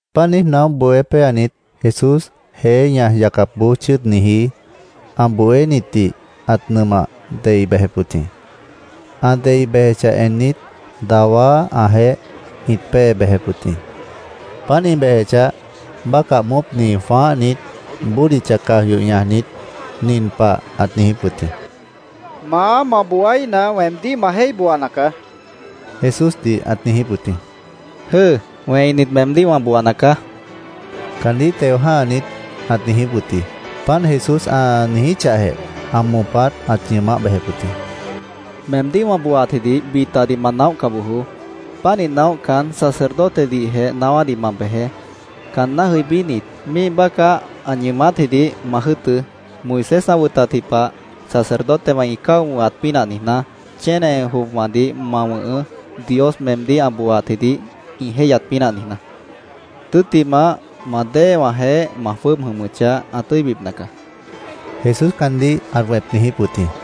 Páant niíj naóh bohé péanit, Jesús jeé ñaj yacapboó chʉ́ʉdniji ã bohénitdih ãt nʉmah dei bejep wʉt jĩ. Ã dei bejechah ennit, dawá ãjeéh ĩt pée bejep wʉt jĩ. Páant ĩ bejechah, bácah moópni jwãáhnit, bódicha caj yoh ñajnit, nin pah ãt niijíp wʉt jĩ: —Maá, ma booaíhna, weemdíh ma jéih booana caá, Jesúsdih ãt niijíp wʉt jĩ. —¡Jʉ́ʉ! Wẽinit meemdíh wã booana caá, caandíh teo jã́hanit, ãt niijíp wʉt jĩ. Páant Jesús ã niijíchahjeh, ã moopát ãt ñʉʉmáh bejep wʉt jĩ. —Meemdíh wã booaatjidih bitadih ma naóhca bojoó. Pánih naóhcan, sacerdotedihjeh naáwádih ma bejeé. Caanná jʉibínit, míih bácah ã ñʉʉmátjidih ma jʉ́ʉtʉ́. Moisés ã wʉtatji pah sacerdotewã ĩ cáo wʉ̃hat pínah niijná, chéne jopwãdih ma wʉ̃hʉʉ́, Dios meemdíh ã booaatjidih ĩ jéihyat pínah niijná. Tʉ́ttimah, ma déewãjeéh ma jwʉ́ʉb jʉmʉchah, ã tʉ́ibipna caá, Jesús caandíh ãt wẽp niijíp wʉt jĩ.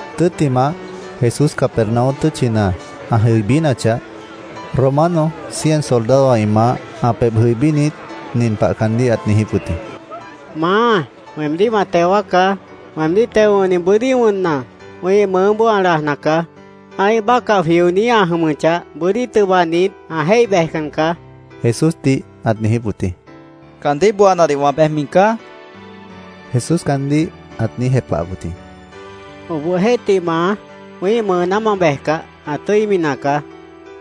Tʉ́ttimah, Jesús Capernaum tʉ́tchina ã jʉibínachah, Romano cien soldadowã ĩ maáh ã pebh jʉibínit, nin pah caandíh ãt niijíp wʉt jĩ: —Maá, weemdíh ma teo wáacá. Weemdíh teo wʉ̃hni bʉ́dí wʉnna, wĩ́ih mʉʉ́boó ã lajna caá. Ã́ih bácah jwioní ã jʉmʉchah, bʉ́dí tʉbanit, ã jéih bejcan caá, Jesúsdih ãt niijíp wʉt jĩ. —Caandíh booanadih wã bejmi caá, Jesús caandíh ãt niíj jepahap wʉt jĩ. —Obohjeéhtih, Maá, wĩ́ih mʉʉná ma bejcah, ã tʉ́imi nacaá.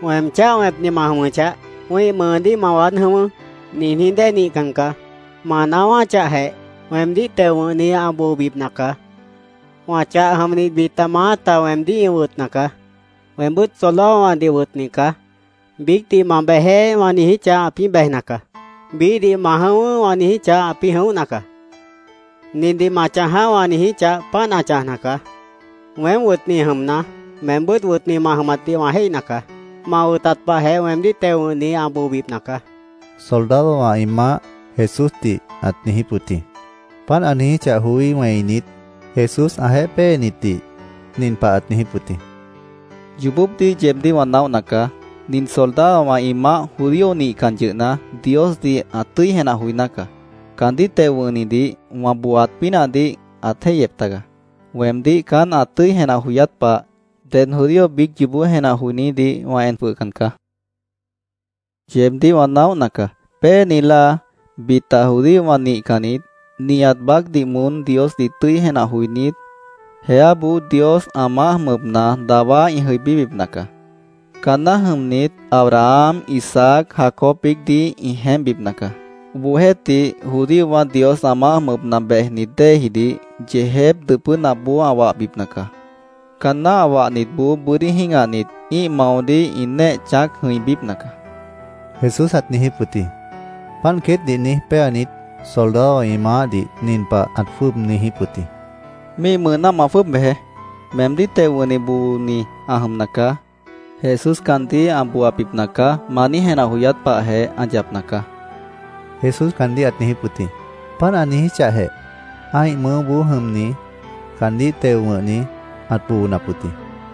Weem cháh wẽpni ma jʉmʉchah, ‘Wĩ́ih mʉʉdíh ma waád jʉ̃ʉ́wʉ́’, niijní dée nihcan caá. Ma naáwáchahjeh, weemdíh teo wʉ̃hni ã boobipna caá. Wã chah jʉmnit bita maáta weemdíh ĩ wʉtna caá. Weembʉ́t soldadowãdih wʉtni caá. Biícdih ‘Ma bejeé’, wã niijíchah, ãpĩ́ bejna caá. Biíhdih ‘Ma jʉ̃ʉ́wʉ́’, wã niijíchah, ãpĩ́ jʉ̃óhna caá. ‘Nindih ma chãjaá’, wã niijíchah, páant ã chãjna caá. Weém wʉtni jʉmna, meembʉ́t wʉtni ma jʉmatdih wã jéihna caá. Ma wʉtat pahjeh weemdíh teo wʉ̃hni ã boobipna caá, soldadowã ĩ maáh Jesúsdih ãt niijíp wʉt jĩ. Páant ã niijíchah joí wẽinit, Jesús ãjeéh péenitdih nin pah ãt niijíp wʉt jĩ: —Yoobópdih yeebdíh wã naóhna caá. Nin soldadowã ĩ maáh judío nihcan yʉhna, Diosdih ã tʉ́i jenah joiná caá. Caandíh teo wʉ̃hnidih wã booaat pínahdih ãt jéihyep taga. Weemdíh caán ã tʉ́i jenah joyát pah, ded judío biíc yoobó jenah joinídih wã en jwʉhcan caá. Yeebdíh wã naóhna caá. Péeni láa bita judíowã nihcannit, nihat baácdih moón Diosdih tʉ́i jenah joinít, jeáboó Dios ã maáh jʉmʉpna dawá ĩ jʉibíbipna caá. Caanná jʉmnit, Abraham, Isaac, Jacob biícdih ĩ jeémpbipna caá. Obohjeéhtih, judíowã Dios ã maáh jʉmʉpna bejnit déejidih, yeejép dʉpʉ́napboó ã wahbipna caá. Caanná ã wahnitboó bʉ́dí jĩ́gahnit, ĩ́ih maodíh ĩ néeh chãác jʉ̃ibípna caá, Jesús ãt niijíp wʉt jĩ. Páant queétdih niíj péanit, soldadowã ĩ maáhdih nin pah ãt jwʉ́ʉb niijíp wʉt jĩ: —Míih mʉʉná ma jwʉ́ʉb bejeé. Meemdíh teo wʉ̃hni booni ã jʉmna caá. ‘Jesús caandíh ã booabipna caá’, ma niíj jenah joyát pahjeh ã yapna caá, Jesús caandíh ãt niijíp wʉt jĩ. Páant ã niijíchahjeh, ã́ih mʉʉ́boó jʉmni caandíh teo wʉ̃hni ãt boonap wʉt jĩ.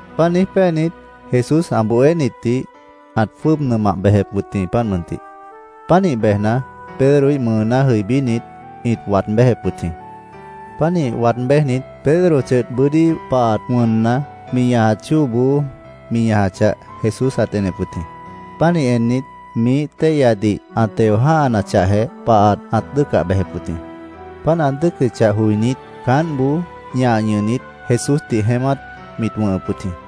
Páant niíj péanit, Jesús ã bohénitdih ãt jwʉ́ʉb nʉmah bejep wʉt jĩ, páant mʉntih. Pánih bejna, Pedroíh mʉʉná jʉibínit, ĩt waad béjep wʉt jĩ. Pánih waad béjnit, Pedro chʉdh bʉ́dí pahat wʉnna, mi ñajat chóoboó mi ñajachah, Jesús ãt enep wʉt jĩ. Pánih ennit, miíh téihyadih ã teo jã́hanachahjeh, pahat ãt dʉ́ʉcah bejep wʉt jĩ. Páant ã dʉ́ʉcʉchah joinít, caántboó ñah ñʉhnit, Jesúsdih jeémát mit wʉ̃hʉp wʉt jĩ.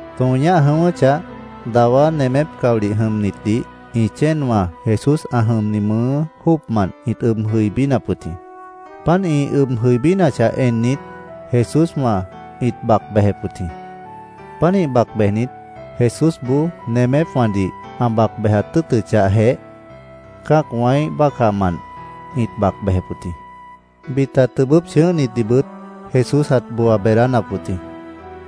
Tõo ñáh jʉ̃ʉ́wʉ́chah, dawá nemép caolih jʉmnitdih ĩ chéenwã Jesús ã jʉmni mʉʉ́ jóocmant ĩt ʉb jʉibínap wʉt jĩ. Páant ĩ ʉb jʉibínachah ennit, Jesúswã ĩt bac bejep wʉt jĩ. Pánih bac bejnit, Jesúsboó nemépwãdih ã bac bejat tʉ́ʉtʉchahjeh, cã́acwãíh bácahmant ĩt bac bejep wʉt jĩ. Bita tʉbʉ́p chʉ̃ʉ́hnitdihbʉt Jesús ãt booa beedánap wʉt jĩ.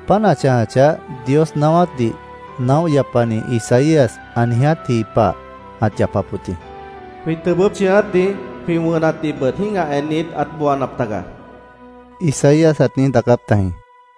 Páant ã chãjachah, Dios naáwátdih naóh yapani Isaías ã niijátji pah ãt yapap wʉt jĩ. “Jwĩ tʉbʉ́p chʉ̃ʉ́átdih, jwĩ wʉnatdihbʉt jĩ́gah ennit, ãt booanap taga”, Isaías ãt niíj daacáp tajĩ.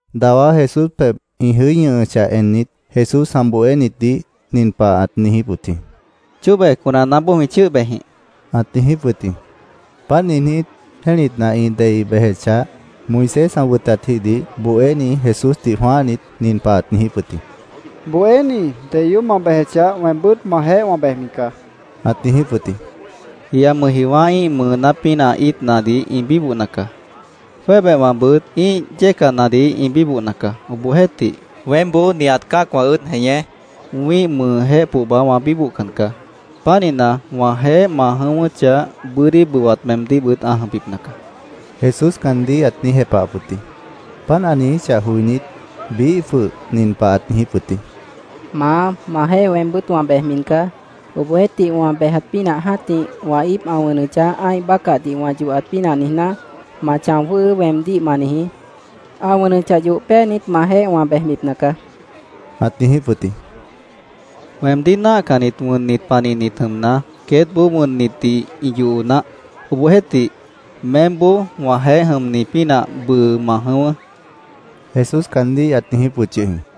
Dawá Jesús pebh ĩ jʉí ñʉhʉchah ennit, Jesús ã bohénitdih nin pah ãt niijíp wʉt jĩ: —Chóbe conanaáboó jwĩ chʉ́ʉh bejjĩh, ãt niijíp wʉt jĩ. Páant niijnít, jẽ́litna ĩ dei bejechah, Moisés ã wʉtatjidih bohéni Jesúsdih jwãáhnit, nin pah ãt niijíp wʉt jĩ: —Bohéní, deyoób ma bejechah, weembʉ́t majeéh wã bejmi caá, ãt niijíp wʉt jĩ. —Jia mʉjjiowã́ ĩ́ih mʉʉ́ pínah íitnadih ĩ bíbohna caá. Jwébehwãbʉt ĩ́ih yécanadih ĩ bíbohna caá. Obohjeéhtih, weémboó nihat cã́acwã ʉ́ʉd jeñé, wĩ́ih mʉʉjéh pohba wã bíbohcan caá. Pánihna, wãjeéh ma jʉ̃ʉ́wʉ́chah, bʉ́dí bʉwat meemdíhbʉt ã jʉmbipna caá, Jesús caandíh ãt niíj jepahap wʉt jĩ. Páant ã niijíchah joinít, biíh jwʉh nin pah ãt niijíp wʉt jĩ: —Maá, majeéh weembʉ́t wã bejmi caá. Obohjeéhtih, wã bejat pínah jã́tih wã íip ã wʉnʉchah, ã́ih bácahdih wã yohat pínah niijná, ‘Ma chão jwʉ́hʉʉ́’, weemdíh ma niijí. Ã wʉnʉchah yoh péanit, majeéh wã bejbipna caá, ãt niijíp wʉt jĩ. —Weemdíh náahcannit wʉnnit panihnit jʉmna, queétboó wʉnnitdih ĩ yoho naáh. Obohjeéhtih, meémboó wãjeéh jʉmni pínah bʉʉ ma jʉ̃ʉ́wʉ́, Jesús caandíh ãt niijíp wʉt yʉh jĩ.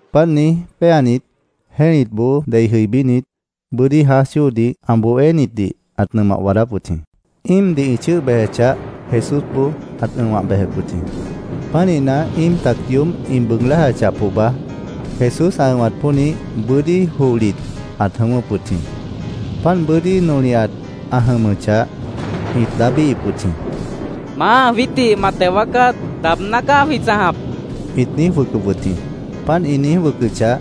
Páant niíj péanit, jẽ́litboó dei jʉibínit, bʉ́dí jãáj chóodih ã bohénitdih ãt nʉmah waadáp wʉt jĩ. Íimdih ĩ chʉ́ʉh bejechah, Jesúsboó ãt ʉ̃wah bejep wʉt jĩ. Pánihna, íim tac yoób ĩ bʉʉg lájachah pohba, Jesús ã ʉ̃wat pónih, bʉ́dí johlit ãt jʉ̃ʉ́wʉ́p wʉt jĩ. Páant bʉ́dí nolihat ã jʉmʉchah, ĩt daábíhip wʉt jĩ. —¡Maá, jwiítdih ma teo wáacá! ¡Daabná caá jwĩ chãjap! ĩt niíj wʉcʉp wʉt jĩ. Páant ĩ niíj wʉcʉchah,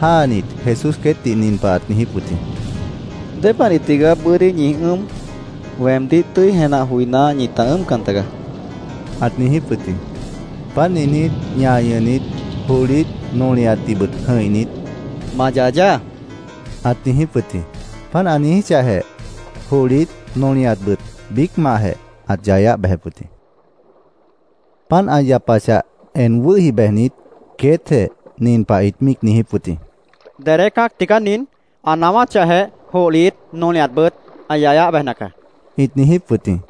jáanit, Jesús queétdih nin pah ãt niijíp wʉt jĩ: —¿Dépanih tigaá bʉ́dí ñi ʉ́ʉm? Weemdíh tʉ́i jenah joiná, ñita ʉ́ʉmcan tagaá, ãt niijíp wʉt jĩ. Páant niijnít, ñah ñʉhnit, johlit, nolihatdihbʉt jʉ̃ihnit, “Ma yayaá”, ãt niijíp wʉt jĩ. Páant ã niijíchahjeh, johlit nolihatbʉt biícmantjeh ãt yayáh bejep wʉt jĩ. Páant ã yapachah, en wʉ́hi bejnit, queétjeh nin pah ĩt míic niijíp wʉt jĩ: —¿Dedé cã́ac tigaá nin? Ã naáwáchahjeh, johlit, nolihatbʉt ã yayáh bejna caá, ĩt niijíp wʉt jĩ.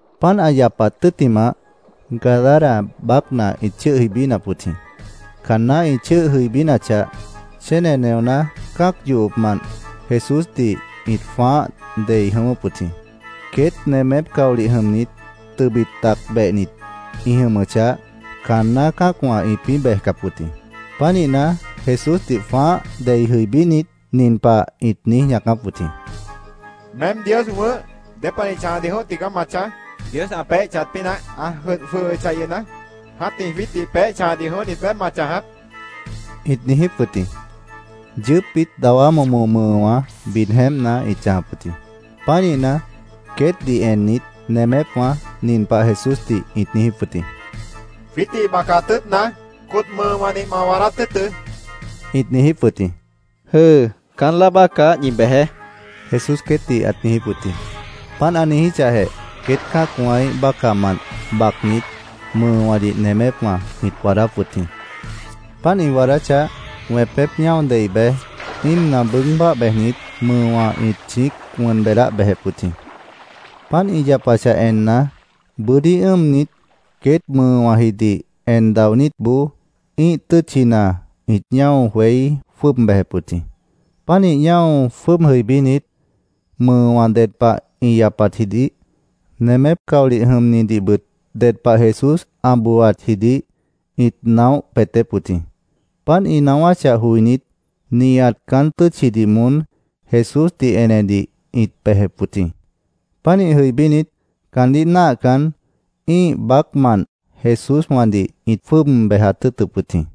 Páant ã yapat tʉ́ttimah, Gadara baácna ĩt chʉ́ʉh jʉibínap wʉt jĩ. Caanná ĩ chʉ́ʉh jʉibínachah, chéne neoná cã́ac yohopmant Jesúsdih ĩt jwãáh dei jʉ̃ʉ́wʉ́p wʉt jĩ. Queét nemép caolih jʉmnit, tʉbit tac behnit ĩ jʉmʉchah, caanná cã́acwã ĩpĩ́ bejcap wʉt jĩ. Pánihna, Jesúsdih jwãáh dei jʉibínit, nin pah ĩt niíj ñaacáp wʉt jĩ: —¿Meém Dios wʉ̃ʉ́h, dépanih chãjadih jʉ̃óh tigaá ma chãj? ¿Dios ã peéh chãjat pínah ã jʉdh jwʉhʉchah yʉhna, jã́tih jwiítdih peéh chãjadih jʉ̃óhnit beé ma chãjap? ĩt niijíp wʉt jĩ. Yʉʉ́pbit dawá momo mʉʉwã bid jeémpna ĩt chãjap wʉt jĩ. Pánihna, queétdih ennit, nemépwã nin pah Jesúsdih ĩt niijíp wʉt jĩ: —Jwiítdih bacat tʉ́ʉtna, cot mʉʉwãdih ma waadát tʉ́ʉtʉ́, ĩt niijíp wʉt jĩ. —Jʉ́ʉ, caán láa bácah ñi bejeé, Jesús queétdih ãt niijíp wʉt jĩ. Páant ã niijíchahjeh, queét cã́acwãíh bácahmant bacnit, mʉʉwãdih nemépwã ĩt waadáp wʉt jĩ. Páant ĩ waadáchah, wẽpép ñáo dei bej, íimna bʉʉ́g báah bejnit, mʉʉwã ĩt chĩíc wʉn beedáh bejep wʉt jĩ. Páant ĩ yapachah enna, bʉ́dí ʉ́ʉmnit, queét mʉʉwãjidih en daonítboó ĩ́ih tʉ́tchina ĩt ñáo jweí jwʉ́ʉb bejep wʉt jĩ. Pánih ñáo jwʉ́ʉb jʉibínit, mʉʉwã ded pah ĩ yapatjidih, nemép caolih jʉmnitdihbʉt ded pah Jesús ã booaatjidih ĩt naóh peetép wʉt jĩ. Páant ĩ naáwáchah joinít, nihat caán tʉ́tchidih moón Jesúsdih enedih ĩt bejep wʉt jĩ. Pánih jʉibínit, caandíh náahcan, ĩ́ih baácmant Jesúswãdih ĩt jwʉ́ʉb bejat tʉ́ʉtʉp wʉt jĩ.